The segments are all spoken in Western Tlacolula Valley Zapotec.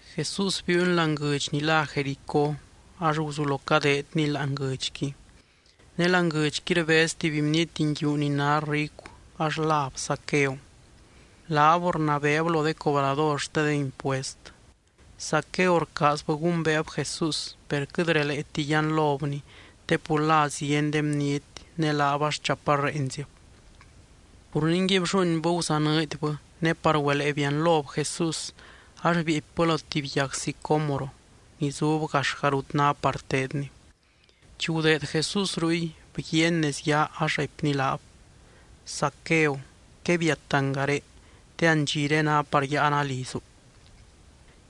Jesús biiuny láani guɨdx ni lá Jericó ax guzulo cadeedny láani guɨdxqui, ne láani guɨdxqui rbez tuby bniety nguiu ni ná ricu ax láb Zaqueo. Laab rnabeeb lo de cobrador xte de impuest. Zaqueo rcaazbɨ gumbeeb Jesús, per quɨt releeti yianlobny te pur la zieny de bniety ne laab ax chaparrenzib. Pur ningui blluuinbɨ guzanɨɨdybɨ ne par güelee bianlob Jesús ax bieepybɨ lo tuby yag sicómoro ni zub gaxga rut ná par teedny. Chi gudeed Jesús ruy, bguiaany nez yaa ax raipny laab: —Zaqueo, quebiat angaré, te andxiré ná par yáana lizu.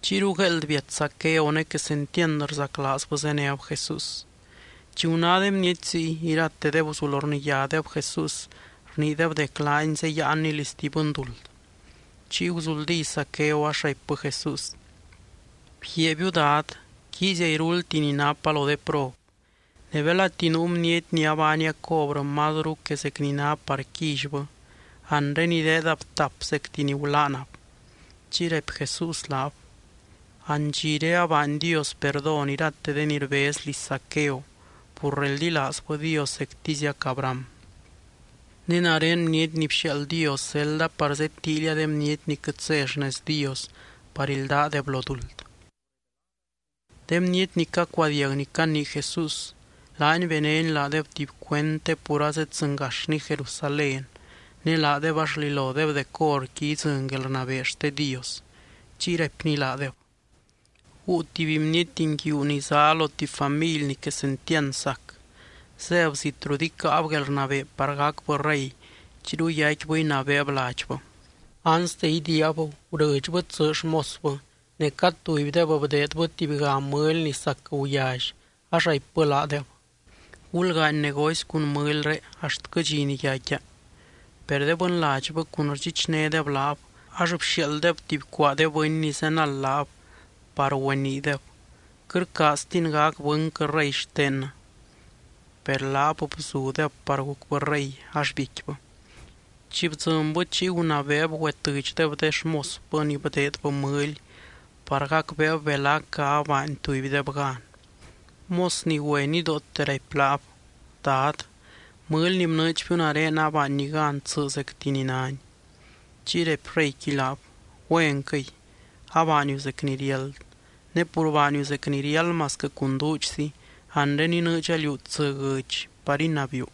Chiyru gueeld biat Zaqueo ne quesentiand rzaclaazbɨ zéneb Jesús. Chi guná de bniety ziy, iratedeb guzulo rniyádeb Jesús rniideb dec laany zeyáanny liz tuby bɨnduld. Chiy guzuldí Zaqueo ax raipbɨ Jesús: —Bguiaabiu, Dad, quiizia iruldti ni napa lo de prob. Ne belati nuu bniety ni abaania cobrɨ mazru que zec ni ná par quillybɨ, anre ideedab tap zecti ni gulaanab. Chiy raipy Jesús laab: —Andxiré abaany Dios perdón irate de ni rbez liz Zaqueo pur reldilaazbɨ Dios zectiziac Abraham. Ne nare Bniety ni bxiaald Dios zelda par zedtíilia de bniety ni quɨt zé xnez Dios par ildaadeb lo duld. De bniety ni cacuadiag ni canii Jesús, laany benény laadeb tuby cuend, te pur azedzɨngaxny Jerusalén ne laadeb ax rlilodeb dec horqui idzɨny guelrnabee xte Dios. Chiy raipny laadeb: —Guu tuby bniety nguiu ni zá lo tuby family ni quesentiand sac. Zéb zit rut icáab guelrnabee par gacbɨ rey chiyru yaicquibɨ inabeeb ladxbɨ. Anste idiiab, gurɨdxbɨ tsɨ xmosbɨ, ne cad tubydeb, bdeedbɨ tubyga mɨly ni sac guyally, ax raipbɨ laadeb: “Gulgaany negocy cun mɨlyré axtquɨ dxi ni yaicquia.” Per de bɨnladxbɨ cun rdxichnédeb laab, ax bxiaalddeb tuby cuaa de bɨny ni zenald laab par güeniideb: “Quɨt rcaaztin gac bɨnquɨ rey xtennɨ.” Per laab bzudeb par gucbɨ rey, ax biecquibɨ. Chi bdzɨnbɨ, chiy gunabeeb güetɨdxdeb de xmosbɨ ni bdeedbɨ mɨly par gacbeeb belacga abaany tubydeb gan. Mos ni güe nidoote raipy laab: “Dad, mɨly ni bnɨɨdxbiu nare abaanni gan tsɨ zecti ni náni.” Chiy raipy reyqui laab: “Güenquɨy, abaaniu zec ni riáld. Ne pur baaniu zec ni riáld masquɨ cun duudxzi anre inɨɨdxa liú tsɨ guɨdx par inabiiu.”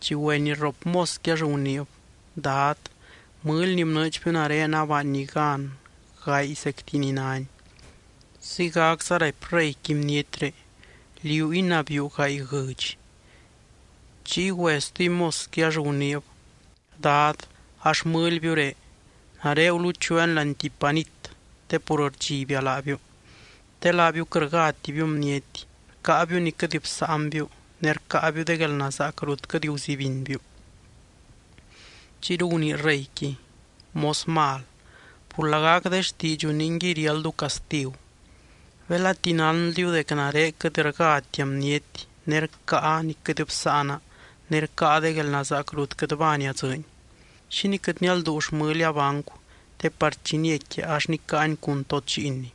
Chi güe ni rrop mosqui ax guniib: “Dad, mɨly ni bnɨɨdxbiu nare abaanni gan gaay zecti ni náni.” Ziygacza raipy reyqui bnietré: “Liú inabiiu gaay guɨdx.” Chiy güe stuby mosqui ax guniib: “Dad, a xmɨlbiuré. Nare guluchuuani láani tuby panit te pur bdxibia laabiu. Te laabiu quɨt rgátibiu bniety, rcáabiu ni quɨt bsáanbiu ne rcáabiu de guelnazaac rut quɨt guzibinbiu.” Chiyru gunii reyqui: “Mos mal, pur lagac de xtiidxu ningui riáldu castigu. Belati nánldiu dec nare quɨt rgátia bniety ne rcáa ni quɨt bsáana ne rcáa de guelnazaac rut quɨt baania dzɨɨny, ¿xínii quɨt nialduu xmɨlia bancu te par chi niecquia ax nicáani cun tod lliinni?”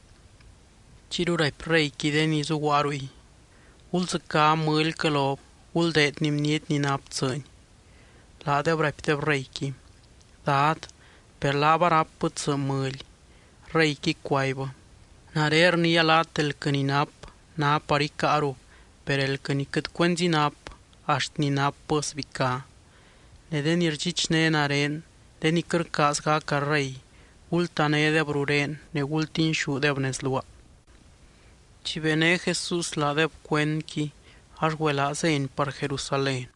Chiyru raipy reyqui de ni zuguaa ruy: “Guldzɨcá mɨlyquɨ lob, guldeedni bniety ni nap tsɨni.” Laadeb raipdeb reyqui: “Dad, per laab arápbɨ tsɨ mɨly.” Reyqui cuaibbɨ: “Nare rniia laat elquɨ ni nap, ná par icáarub. Per elquɨ ni quɨt cuenzi nap, axt ni napbɨ sbicá. Ne de ni rdxichné nare, de ni quɨt rcaaz gaca rey, gultanédeb rurén, ne gultinxúdeb nez luaa.” Chi bené Jesús laadeb cuendqui ax güelaa zény par Jerusalén.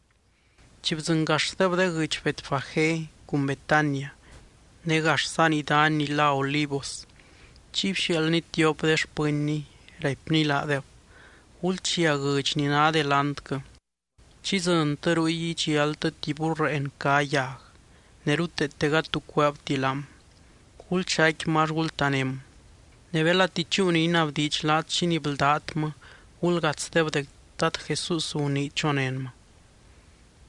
Chi bdzɨngaxdeb de guɨdx Betfagé cun Betania, ne gaxza nii dany ni lá Olivos, chiy bxiaaldny tiop de xpɨnny, raipny laadeb: —Gulchia guɨdx ni ná delantquɨ. Chi idzɨntɨ ruy idxialtɨ tuby burreen cá yag, ne ruteete gady tu cueebti laam. Gulxaicquimɨ ax gultaném. Ne belati chúu ni inabdiidx laat xínii bldátmɨ, gulgatsdeb dec Dad Jesús gunii chonénmɨ.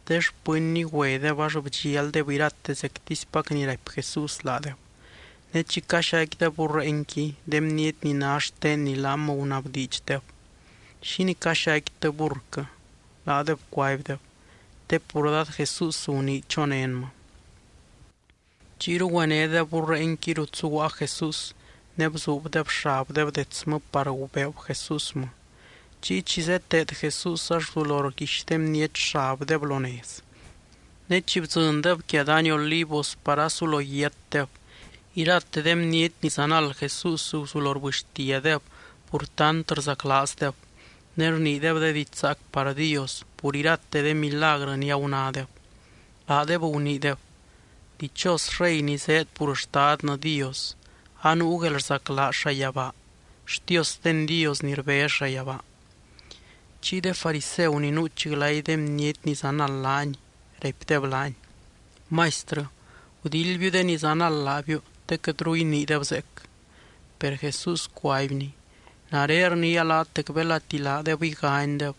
De xpɨnny güedeb ax bdxialdeb irate zectispac ni raipy Jesús laadeb. Ne chi caxaicquideb burreenqui, de bniety ni ná xtenni laam gunabdiidxdeb: —¿Xínii caxaicquitɨ burrquɨ? Laadeb cuaibdeb: —Te pur Dad Jesús gunii chonénmɨ. Chiyru güenédeb burreenqui rut zuguaa Jesús, ne bzuubdeb xabdeb detsmɨ par gubeeb Jesúsmɨ. Chiy chi zeteed Jesús, ax guzulo rguix de bniety xabdeb lo nez. Ne chi bdzɨndeb quia dany Olivos par asulo yiatdeb, irate de bniety ni zanald Jesús guzulo rbɨxtiadeb pur tant rzaclaazdeb, ne rniideb de diidx zaac par Dios pur irate de milagrɨ ni agunádeb. Laadeb guniideb: —¡Dichos rey ni zéed pur Xtadnɨ Dios! ¡Anuu guelrzaclaaz llayabaa! ¡Xtiosten Dios ni rbez llayabaa! Chiy de fariseu ni nuuch glay de bniety ni zanald laany, raipdeb laany: —Maistrɨ, gudildbiu de ni zanald laabiu te quɨtru iniideb zeec. Per Jesús cuaibny: —Nare rniia laat dec belati laadeb iganydeb,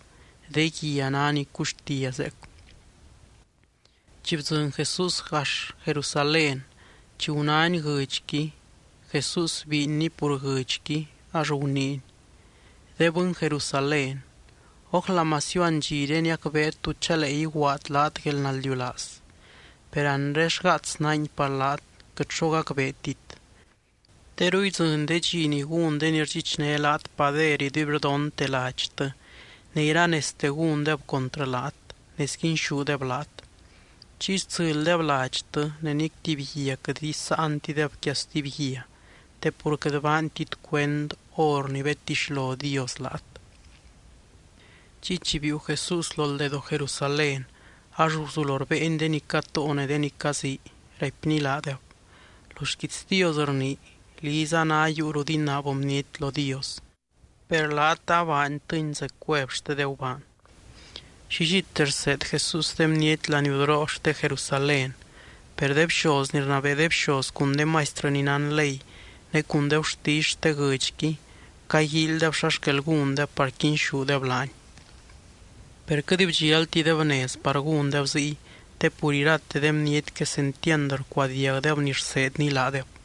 de guia ná ni cuxtia zeec. Chi bdzɨny Jesús gax Jerusalén, chi gunány guɨdxqui, Jesús biinny pur guɨdxqui, ax guniiny: —¡De bɨny Jerusalén, ójla masiu andxiré niacbeet tú chalee iguaad laat guelnaldiulaaz! Per anre xgaats nángui par laat, quɨt xo gacbeetit. Teru idzɨny de dxi chi gún de ni rdxichné laat pader iduibrdonte ladxtɨ, ne iranezte gúndeb contrɨ laat, ne sguinxúdeb laat. Chiy stsɨlydeb ladxtɨ ne nic tuby guia quɨt isáantideb quia stuby guia, te pur quɨt baantit cuend hor ni bedtixlo Dios laat. Chiy chi biiu Jesús lo ldedoo Jerusalén ax guzulo rbéeny de ni catóo ne de ni cazii, raipny laadeb: —Lo xquiits Dios rnii: “Liza ná yuu rut inaab bniety lo Dios.” Per laat abaantɨni zec cuev xte de gubaan. Llillite rseed Jesús de bniety laniudoroo xte Jerusalén, per de bxoz ni rnabee de bxoz cun de maistrɨ ni nán ley, ne cun de gurtisy xte guɨdxqui, caguíilydeb xa xquel gúndeb par quinxúdeb laany. Per quɨt bdxialtideb nez par gúndeb ziy, te pur irate de bniety quesentiand rcuadiagdeb ni rseedny laadeb.